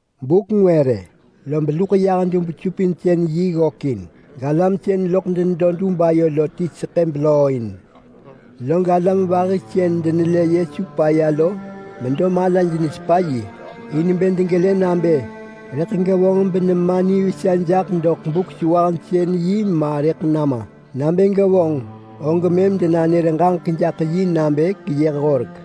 Buk ngwë rë, lob luḳ yah dub-supinsën-yi ggök yahin, galam sën loḳ denedo dub ayo lo ti seḳë belooin. Log alam vahi sën denelë Yesu paya lo medo malaj nesepa yi, in bë degelë nabë rëḳ gevonġ benema nivesa jaḳ doḳ Buk-sewahsën-yi ma rëḳ nama. Nabë gevonġ, og mëm denanër ġaġek jaḳ yi nabë keyëh horek.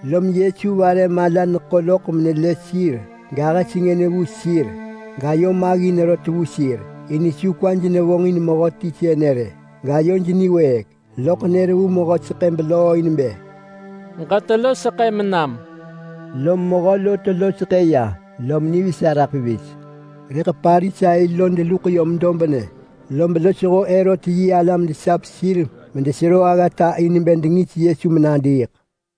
Lom Yesu vare mala neḳo loḳ menelë sir gahë sengën vu sir gayo maggin rot vu sir, in su kwaj nevonġin mehöti sënë rë, gayoj niwëëk. Loḳ nër vu mehö seḳë belooin bë, “Ġetelo seḳëm nam!” Lom mehö lo telo nema ya, lom nivesa raḳ pevis. Rëḳ Parisai lo deluḳ yom dobnë, lob losho Herot yi alam desap sir medenesero aggata in bë dengis Yesu menadiiḳ.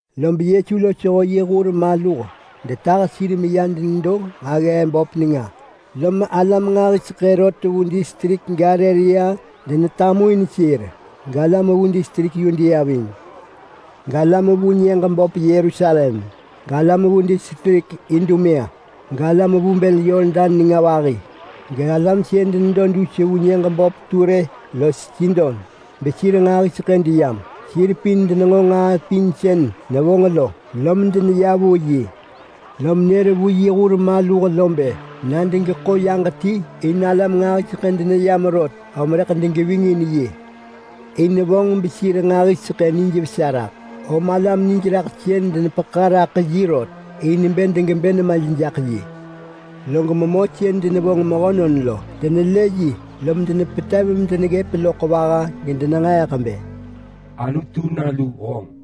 Lob Yesu losho yi hur maluh detah sir meya denedo nġaggee böp nenga, lom alam nġahiseḳë rot vu distrik Galilea denetamuin sir. Galam vu distrik Yudea ving. Galam vu nyëġ böp Yerusalem, galam vu distrik Idumea, galam vu bël Yordan vahi-yi. Galam sën denedo dus vu nyëġ böp Ture los Sidon, besir nġahiseḳë deyam. Sir pin denenġo nġaa pin sën nevonġ lo, lom deneya vu yi. Lom nër vu yi hur maluh bë na degeḳo yaġ ti, in alam nġahiseḳë deneyam rot om rëḳ degeving in yi. In vonġ sir nġahiseḳë benijvesa raḳ, om alam nijraḳsën denepeḳa raḳ yi rot in bë degebë nemaj jaḳ yi. Log memö sën denegwanġ ya mehönon medenevonġ lo, denelë yi lom denepetev medeneggëp loḳ vaha gedenenġeeḳ bë, “Anutu nalu honġ!”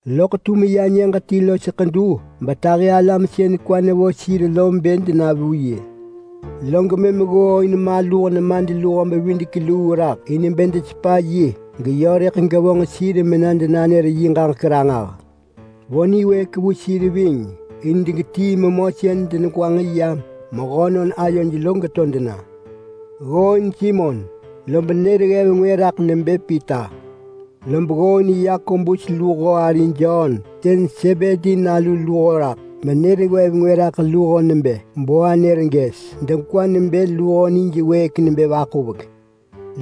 Loḳ tum ya nyëġ ti los ḳedu betahi alam sën kwa nevo sir lo bë dena vu yi. Log ggooin maluh nemadluho-bevidek-luu raḳ in bë desepa yi geyö rëḳ gevonġ sir mena denanër yi ġaġek ranġah. Vo niwëëk vu sir ving in degetii memö sën denegwanġ ya mehönon ayoj lo geto dena. Ggooin Simon, lob nër ggev ngwë raḳ nebë Pita. Lob ggooin Yakobus luho ari Jon sën Sebedi nalu luho raḳ, benër ggev ngwë raḳ luho nebë Boanerges, (degwa nebë luho nij wëëk nebë vaḳuvek).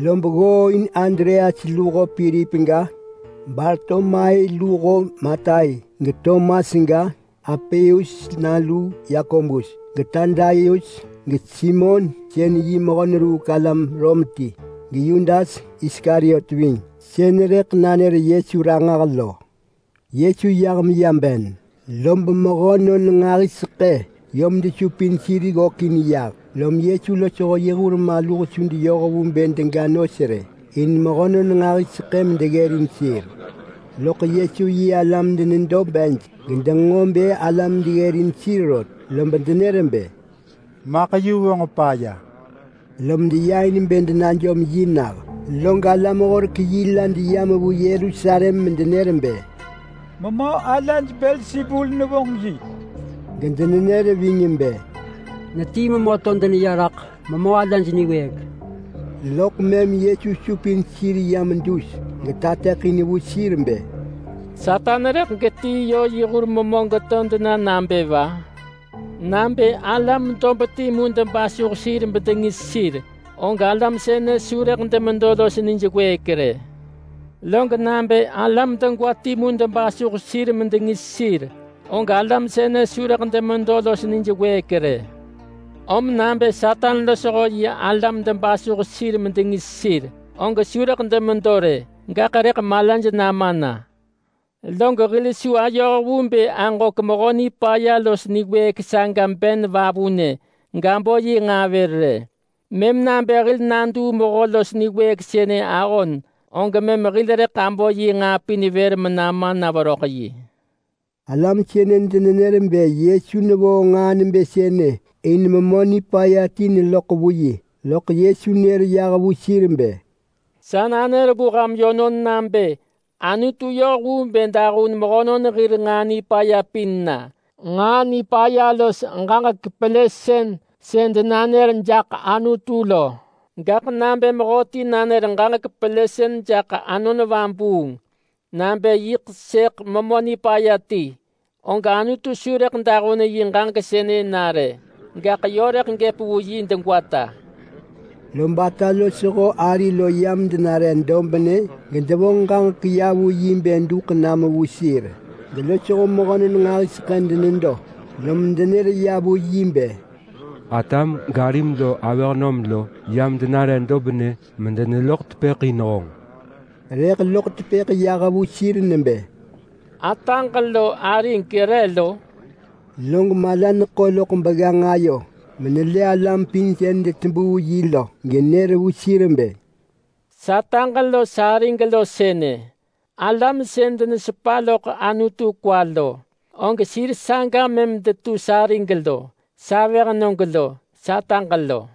Lob ggooin Andreas luho Pilip ga, Bartolomai luho Matai, geTomas ga, Alpeus nalu Yakobus, geTadaius, geSimon sën yi mehö-neruuk-alam-Rom ti, geYudas Iskariot ving, sën rëḳ nanër Yesu ranġah lo. Yesu yah meya ben lob mehönon nġahiseḳë yom desupin sir ggökin yah, lom Yesu losho yi hur maluh su deyoh vu bë dega nos rë, in mehönon nġahiseḳë medeggërin sir. Loḳ Yesu yi alam denedo bej gedenġo bë alam deggërin sir rot, lob denër bë, “Maḳ yu vonġ paya!” Lom deya in bë denajom yi nah. Log alam-horek-yi la deyam vu Yerusalem medenenër bë, “Memö alaj Belsebul nevonġ yi!” Gedenenër ving bë, “Netii memö to deneya raḳ memö alaj niwëëk!” Loḳ mëm Yesu supin sir yam dus getateḳin vu sir bë, “Satan rëḳ getii yö yi hur memö geto dena nabë va? Nabë alam dob timu debasuh sir bedengis sir, og alam sënë su rëḳ demedo los nij wëëk rë. Log nabë alam degwa timu debasuh sir medengis sir, og alam sënë su rëḳ demedo los nij wëëk rë. Om nabë Satan losho yi alam debasuh sir medengis sir, og su rëḳ demedo rë, gaḳ rëḳ malaj nama na. Log hil su ayoh vu bë aġök Mehö Nipaya los niwëëk saga ben vavunë gabo yi nġaa vër rë. Mëm nabë hil naduu Mehö los niwëëk sënë ahon, og mëm hil rëḳ abo yi nġaa pin vër menama na veröḳ yi.” Alam sënë denenër bë Yesu nevonġ nġaa nebë sënë in memö nipaya ti nevonġ yi, loḳ Yesu nër yah vu sir bë, “Sa nanër vu ham yönon nabë Anutu yoh vu bë dahun mehönon hir nġaa nipaya pin na, nġaa nipaya los ġaġek pelësën sën denanër jaḳ Anutu lo. Gaḳ nabë mehöti nanër ġaġek pelësën jaḳ Anon Vabuung (nabë yiḳ sëëḳ memö nipaya ti), og Anutu su rëḳ dahun yi ġaġek sënë na rë, gaḳ yö rëḳ gëp vu yi degwata.” Lob ata losho ari lo yam denare dobnë gedevonġ ġaġek ya vu yi bë duḳ na vu sir. Gelosho mehönon nġahiseḳë denedo, lom denër vu yi bë, “Atam garim lo avëhnöm lo yam denare dobnë medeneloḳ tepëḳ in honġ!” Rëḳ loḳ tepëḳ yah vu sir nebë, “Ataġ lo arig re lo?” Log mala neḳo loḳ begganġ ayo menelë alam pin sën detebuu yi lo genër vu sir bë, “Sataġ lo sarig lo sënë! Alam sën denesepa loḳ Anutu kwa lo, og sir saga mëm detu sarig lo, savëhnög lo, sataġ lo.”